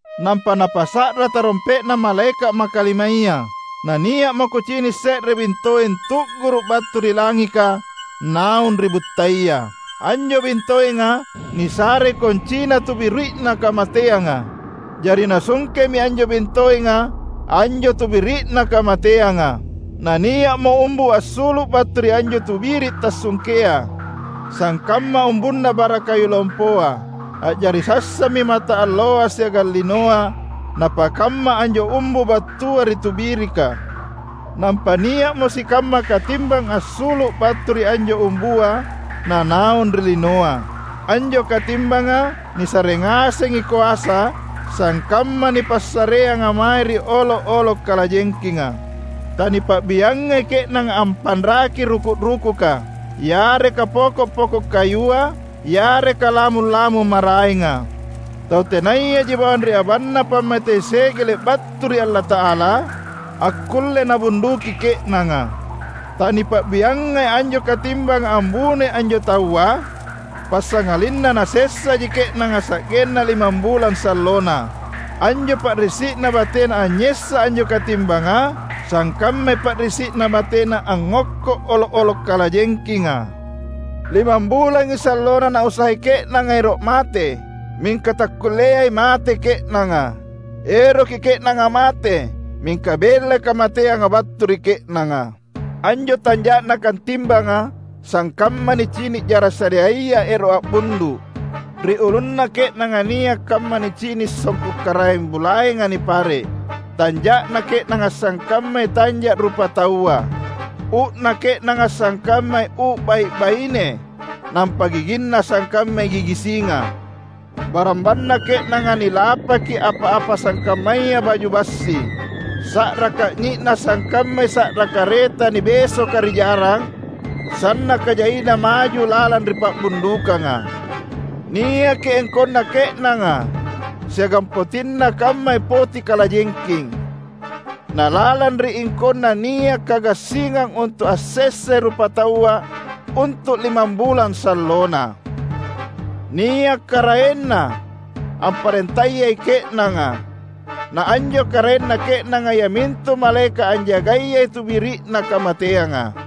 Nampa napasa’ra tarompe’na malaeka’ makalimaya; na nia’mo kucini’ se’re bintoeng tu’guru’ battu ri langika naung ri buttaya. Anjo bintoenga nisarei koncina tubiri’na kamateanga. Jari nasungkemi anjo bintoenga anjo tubiri’na kamateanga; na nia’mo umbu assulu’ battu ri anjo tubiri’ tassungkea, sangkamma umbunna bara kayu lompoa. A’jari sassammi mataalloa siagang linoa napakamma anjo umbu battua ri tubirika. Nampa nia’mo sikamma katimbang assulu’ battu ri anjo umbua nanaung ri linoa. Anjo katimbanga nisare ngasengi koasa sangkamma nipassareanga mae ri olo’-olo’ kalajengkinga. Tanipa’biangai ke’nanga ampanraki ruku’-rukuka, yareka poko’-poko’ kayua, yareka lamung-lamung maraenga. Tau tenayaji bawang ri abanna pammatei segele’ battu ri Allata’ala, akkulle nabunduki ke’nanga. Tanipa’biangai anjo katimbanga ambunoi anjo taua, passangalinna nasessaji ke’nanga sa’genna limambulang sallona. Anjo pa’risi’na batena anynyessa anjo katimbanga, sangkammai pa’risi’na batena angngokko’ olo’-olo’ kalajengkinga. Limambulangi sallona nausahai ke’nanga ero’ mate, mingka takkulleai mate ke’nanga; eroki ke’nanga mate, mingka bellai kamateanga battu ri ke’nanga. Anjo tanja’na katimbanga sangkamma nicini’ jarang sadiaya ero’ a’bundu’. Ri ulunna ke’nanga nia’ kamma nicini’ songko’ karaeng bulaenga nipare’. Tanja’na ke’nanga sangkammai tanja’ rupataua. Uu’na ke’nanga sangkammai uu’ bai’-baine, nampa giginna sangkammai gigi singa. Barambanna ke’nanga nilapakki apa-apa sangkammaya baju bassi. Sa’ra ka’nyi’na sangkammai sa’ra kareta nibesoka ri jarang, sannaka jaina maju lalang ri pa’bundukanga. Nia’ ingkonna ke’nanga, siagang potinna kammai poti kalajengking. Na lalang ri ingkonna nia’ kagassingang untu’ ansessai rupataua untu’ limambulang sallona. Nia’ karaenna, amparentayai ke’nanga; na anjo karaenna ke’nanga iamintu malaeka’ anjagayai tubiri’na kamateanga.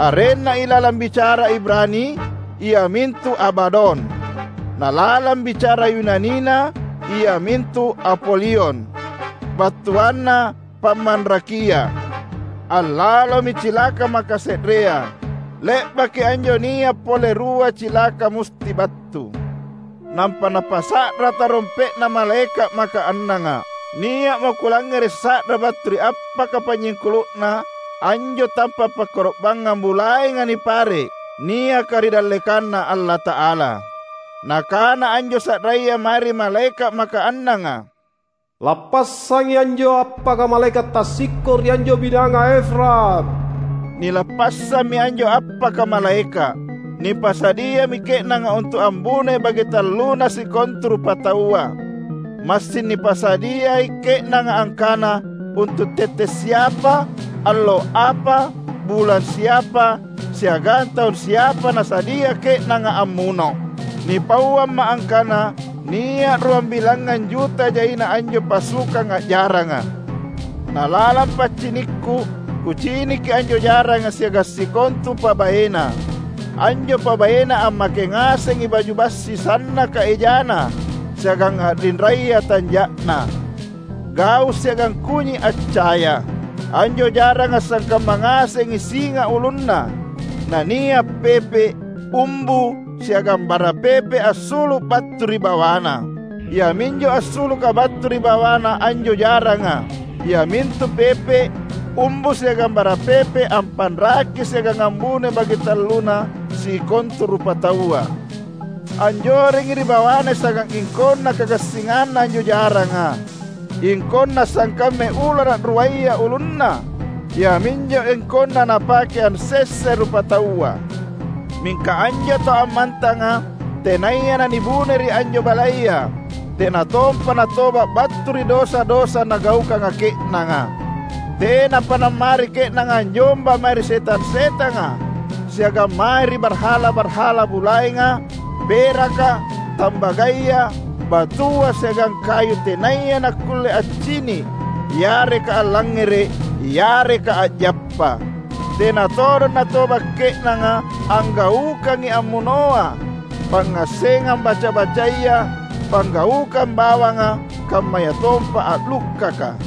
Arenna ilalang bicara Ibrani iamintu Abadon; na lalang bicara Yunanina iamintu Apolion (battuanna "Pammanrakia"). Allalomi cilaka makase’rea. Le’baki anjo nia’ pole rua cilaka musti battu. Nampa napasa’ra tarompe’na malaeka’ makaannanga. Nia’mo kulangngere’ sa’ra battu ri appaka panyingkulu’na anjo tampa’ pakkoro’bangngang bulaenga nipare’ niaka ri dallekanNa Allata’ala. Nakana anjo sa’raya mae ri malaeka’ makaannanga, "Lappassangi anjo appaka malaeka’ tassikko’ ri anjo Binanga Efrat!" Nilappassammi anjo appaka malaeka’. Nipasadiami ke’nanga untu’ ambunoi bage talluna sikontu rupataua; massing nipasadiai ke’nanga angkana untu’ tette’ siapa, allo apa, bulang siapa, siagang taung siapa nasadia ke’nanga ammuno. Nipauamma’ angkana nia’ ruambilangngang juta jaina anjo pasukang a’jaranga. Na lalang paccinikku, kuciniki anjo jaranga siagang sikontu pabaena. Anjo pabaena ammake ngasengi baju bassi sannaka ejana siagang a’rinraya tanja’na, gau’ siagang kunyi’ accaya. Anjo jaranga sangkamma ngasengi singa ulunna; na nia’ pepe’, umbu, siagang bara pepe’ assulu’ battu ri bawana. Iaminjo assuluka battu ri bawana anjo jaranga, iamintu: pepe’, umbu siagang bara pepe’ ampanraki siagang ambunoi bage talluna sikontu rupataua. Anjorengi ri bawana siagang ingkonna kagassinganna anjo jaranga. Ingkonna sangkammai ulara’ ruaya ulunna. Iaminjo ingkonna napake ansessai rupataua. Mingka anjo tau ammantanga, tenaya nanibunoi ri anjo balaya, tena tompa natoba’ battu ri dosa-dosa nagaukanga ke’nanga. Tenapa nammari ke’nanga anynyomba mae ri setang-setanga, siagang mae ri barhala-barhala bulaenga, peraka, tambagaya, batua siagang kayu tenaya nakkulle accini’ yareka allangngere’, yareka a’jappa. Tena todong natoba’ ke’nanga anggaukangi ammunoa, pangngassengang baca-bacaya, panggaukang bawanga, kammayatompa a’lukkaka.